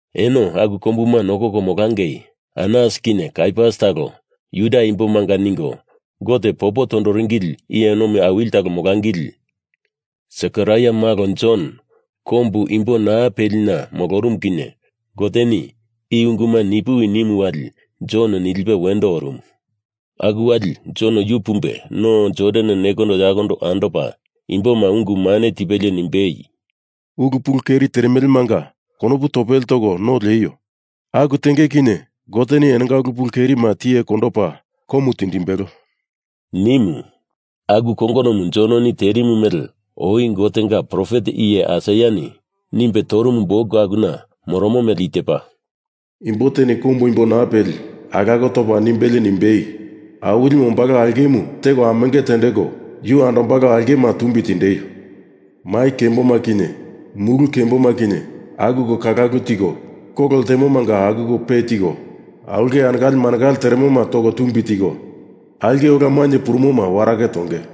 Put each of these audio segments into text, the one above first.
Eno aku kombuma nokoko molangei Anas kinye Kaiafas talo Juda Imbomanga ningo Gote popo tondoringi iye nomi awili talo molangili. Sekaraia malo Jon kombu imbo naa pelina molorumu kinye Goteni i unguma ni puwi nimu wali Jon nilipe wendo orumu. Aku wali Jon yu pumbe No Jordan nekondo yakondo andopa imboma ungu mane tipelie nimbei, “Ulu pulu keri teremelemanga konopu topele toko no lieio! Aku tenge kinye Goteni enonga ulu pulu kerima tiye kondopa komu tindimbelo,” nimu. Aku kongonomu Jononi terimu mele oi Gotenga profet iye Aisaiani nimbe torumu buk akuna moromo mele i tepa, Imbo teni kombu imbo naa peli alako topa nimbelie nimbei, Awilimu ombalo aulkemu teko amenge tendeko yu andombalo aulkema tumbi tindeio! Mai kemboma kinye mulu kemboma kinye akuko kalakulu tiko, kolo ltemomanga akuko pe tiko, aulke anekale manekale teremoma toko tumbi tiko, aulke ola mainye purumoma warake tonge.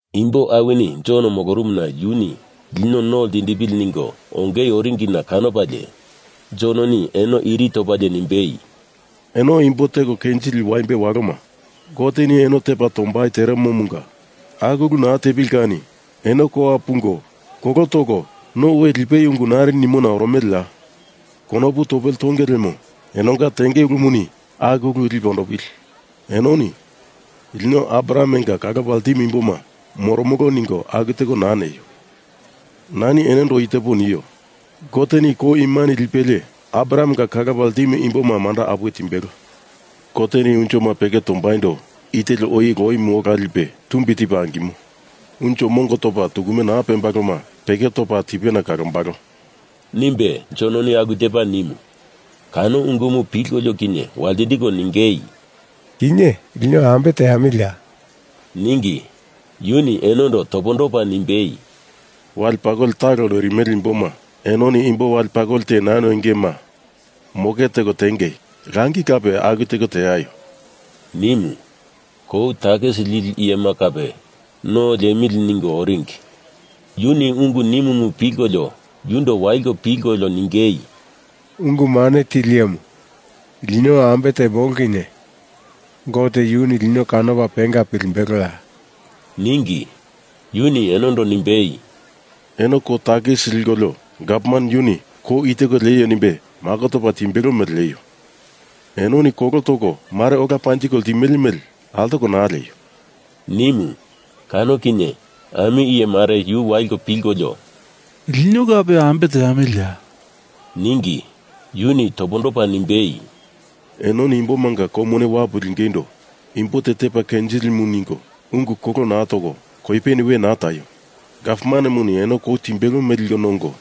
Imbo awini Jon molorumuna yuni lino no ltindipili ningo ongei oringina kanopalie, Jononi eno iri topalie nimbei, “Eno imbo teko kenjili waimbe waloma, Goteni eno tepa tombai teremomunga aku ulu naa tepili kani eno kowa pungo kolo toko no we lipeio ungu nari nimona oromeleya? Konopu topele tonge lemo enonga tenge ulumuni aku ulu lipe ondopili. Enoni lino Abrahamenga kalopa ltimo imboma moromolo ningo aku teko naa neio. Nani enondo i tepo nio. Goteni kou imani lipelie Abrahamenga kalopa ltimu imboma manda apuwe timbelo. Goteni unjoma peke tombaindo i teli oi loimu ola lipe tumbi tipe angimo. Unjo mongo topa tukume naa pembaloma peke topa tipena kalombalo,” nimbe Jononi aku tepa nimu. Kano ungumu pilkolio kinye waltindiko ningei, “Kinye lino ambe teamiliya?” ningi. Yuni enondo topondopa nimbei, “Wale pakoli talo noirimele imboma enoni imbo wale pakoli te naa noingema moke teko tiengei! Langi kape aku tekola teaio,” nimu. Kou takisi lili iyema kape no liemili ningo oringi. Yuni ungu nimumu pilkolio yundo waliko pilkolio ningei, “Ungu Mane Tili Iyemu, lino ambe temolo kinye Gote yuni lino kanopa penga pilimbeloya?” ningi. Yuni enondo nimbei, “Eno kou takisi likolio gavman yuni kou i teko lieio nimbe mako topa timbelo mele lieio! Enoni kolo toko mare ola panjiko ltimele mele altoko naa lieio,” nimu. Kano kinye ami iye mare yu waliko pilkolio, “Lino kape ambe teamiliya?” ningi. Yuni topondopa nimbei, “Enoni imbomanga kou mone wapu lingeindo imbo te tepa kenjilimu ningo ungu kolo naa toko koipeni we naa taio! Gavmanemuni eno kou timbelo mele liko nongo,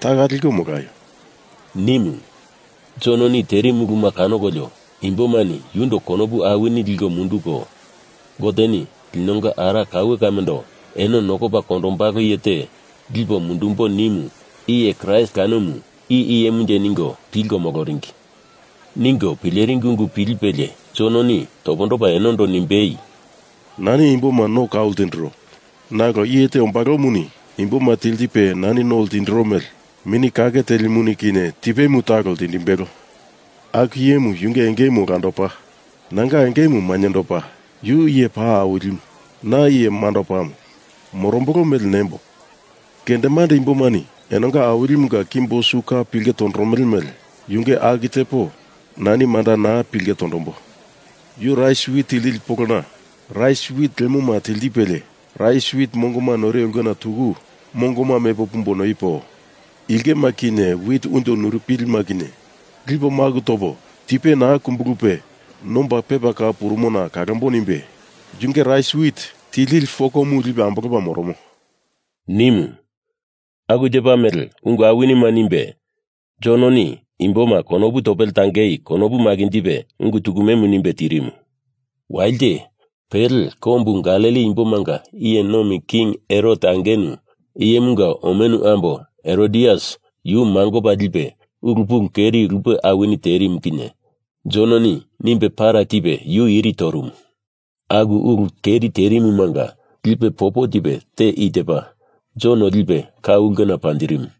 taka liko molaio,” nimu. Jononi terimu ulu kanokolio imbomani yundo konopu awini liko munduko, Goteni linonga ara kaue kamendo eno nokopa kondombalo iye te lipo mundumbo nimu iye Kraist kanomu i iyemunje ningo pilko moloringi. Ningo pileringi ungu pilipelie Jononi topondopa enondo nimbei, “Nani imboma no kau ltindiro. Nalo iye te ombalomuni imboma tiltipe nani no ltindiro mele Mini Kake Telimuni, kinye tipemu talo ltindimbelo. Aku iyemu yunge engemu olandopa, nanga engemu mainyendopa. Yu iye paa awilimu, na iye mandopamu. Morombolo mele nembo: Kendemande imbomani enonga awilimunga kimbo su ka pilke tondoromele mele yunge aku tepo nani manda naa pilke tondombo. Yu rais wit tiltili polona rais wit lemoma tiltipelie rais wit mongoma noiro ulkena tuku mongoma mepo pumbo noipo, ilkema kinye wit unjo nurupilima kinye lipo maku topo tipe naa kumbulupe nomba pepa kau purumona kalambo nimbe yunge rais wit tiltili fokomu lipe ambolopa moromo,” nimu. Aku tepa mele ungu awinima nimbe Jononi imboma konopu topele tangei konopu makinjipe ungu tukumemu nimbe tirimu. Walite, pele, kombu Galili imbomanga iye nomi king Herot angenu iyemunga omenu ambo Herodias yu mangopa lipe ulu pulu keri lupe awini terimuma kinye Jononi nimbe para tipe yu iri torumu. Aku ulu keri terimumanga lipe popo tipe te i tepa: Jon lipe ka ulkena panjirimu.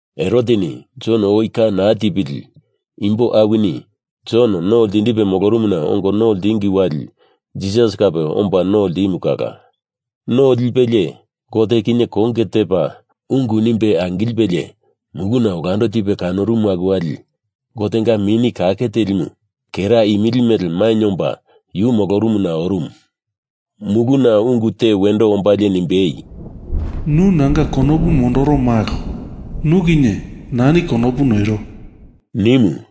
Heroteni Jon oi ka naa tipili imbo awini Jon no ltindipe molorumuna ongo no ltingi wali Jisas kape omba no ltimu kala. No lipelie Gote kinye konge tepa ungu nimbe angilipelie muluna olando tipe kanorumu aku wali Gotenga Mini Kake Telimu kera imili mele mainye omba yu molorumuna orumu. Muluna ungu te wendo ombalie nimbei, “Nu nanga konopu mondoro malo. Nu kinye nani konopu noiro,” nimu.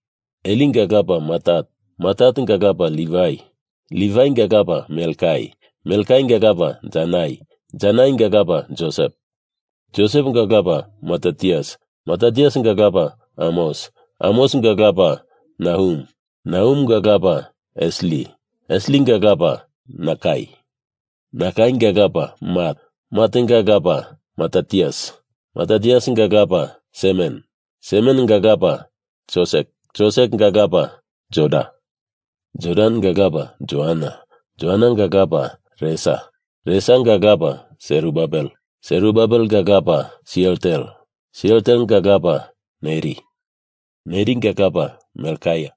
Elinga lapa Matat. Matatenga lapa Livai. Livainga lapa Melkai. Melkainga lapa Janai. Janainga lapa Josep. Joseponga lapa Matatias. Matatiasinga lapa Amos. Amosinga lapa Nahum. Nahumonga lapa Esli. Eslinga lapa Nakai. Nakainga lapa Mat. Matenga lapa Matatias. Matatiasinga lapa Semen. Semenenga lapa Josek. Josekenga lapa Joda. Jodanga lapa Joanan. Joanananga lapa Resa. Resanga lapa Serubabel. Serubabelenga lapa Sealtiel. Sealtielenga lapa Neri. Neringa lapa Melkai.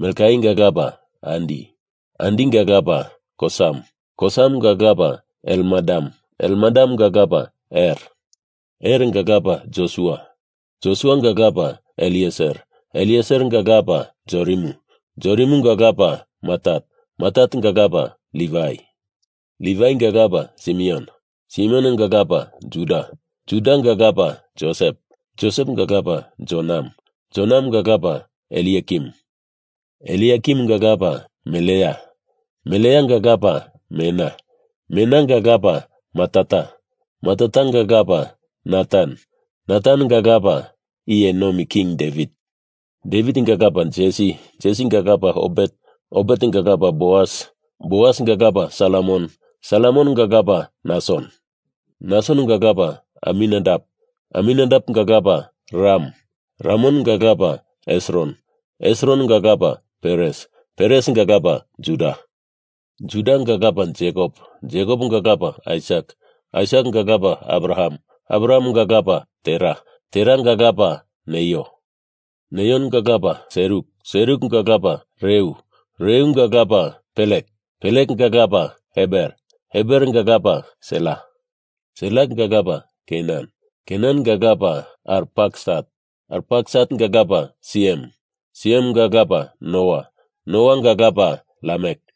Melkainga lapa Adi. Adinga lapa Kosam. Kosamenga lapa Elmadam. Elmadamenga lapa Er. Erenga lapa Josua. Josuanga lapa Elieser. Elieseranga lapa Jorimu. Jorimunga lapa Matat. Matatenga lapa Livai. Livainga lapa Simeon. Simeononga lapa Juda. Judanga lapa Josep. Josep lapa Jonam. Jonamunga lapa Eliakim. Eliakimunga lapa Melea. Meleanga lapa Mena. Menanga lapa Matata. Matatanga lapa Natan. Natanenga lapa Iye Nomi King Devit. Devitinga lapa Jesi. Jesinga lapa Obet. Obetenga lapa Boas. Boasinga lapa Salmon. Salmonenga lapa Nason. Nasononga lapa Aminadap. Aminadapenga lapa Ram. Ramonga lapa Hesron. Hesroninga lapa Peres. Peresinga lapa Juda. Judanga lapa Jekop. Jekoponga lapa Aisak. Aisakinga lapa Abraham. Abrahamenga lapa Tera. Teranga lapa Neio. Neionga lapa Seruk. Serukenga lapa Reu. Reunga lapa Pelek. Pelekenga lapa Eber. Eberenga lapa Sela. Selanga lapa Kenan. Kenanenga lapa Arpaksat. Arpaksatenga lapa Siem. Siemenga lapa Noa. Noanga lapa Lamek.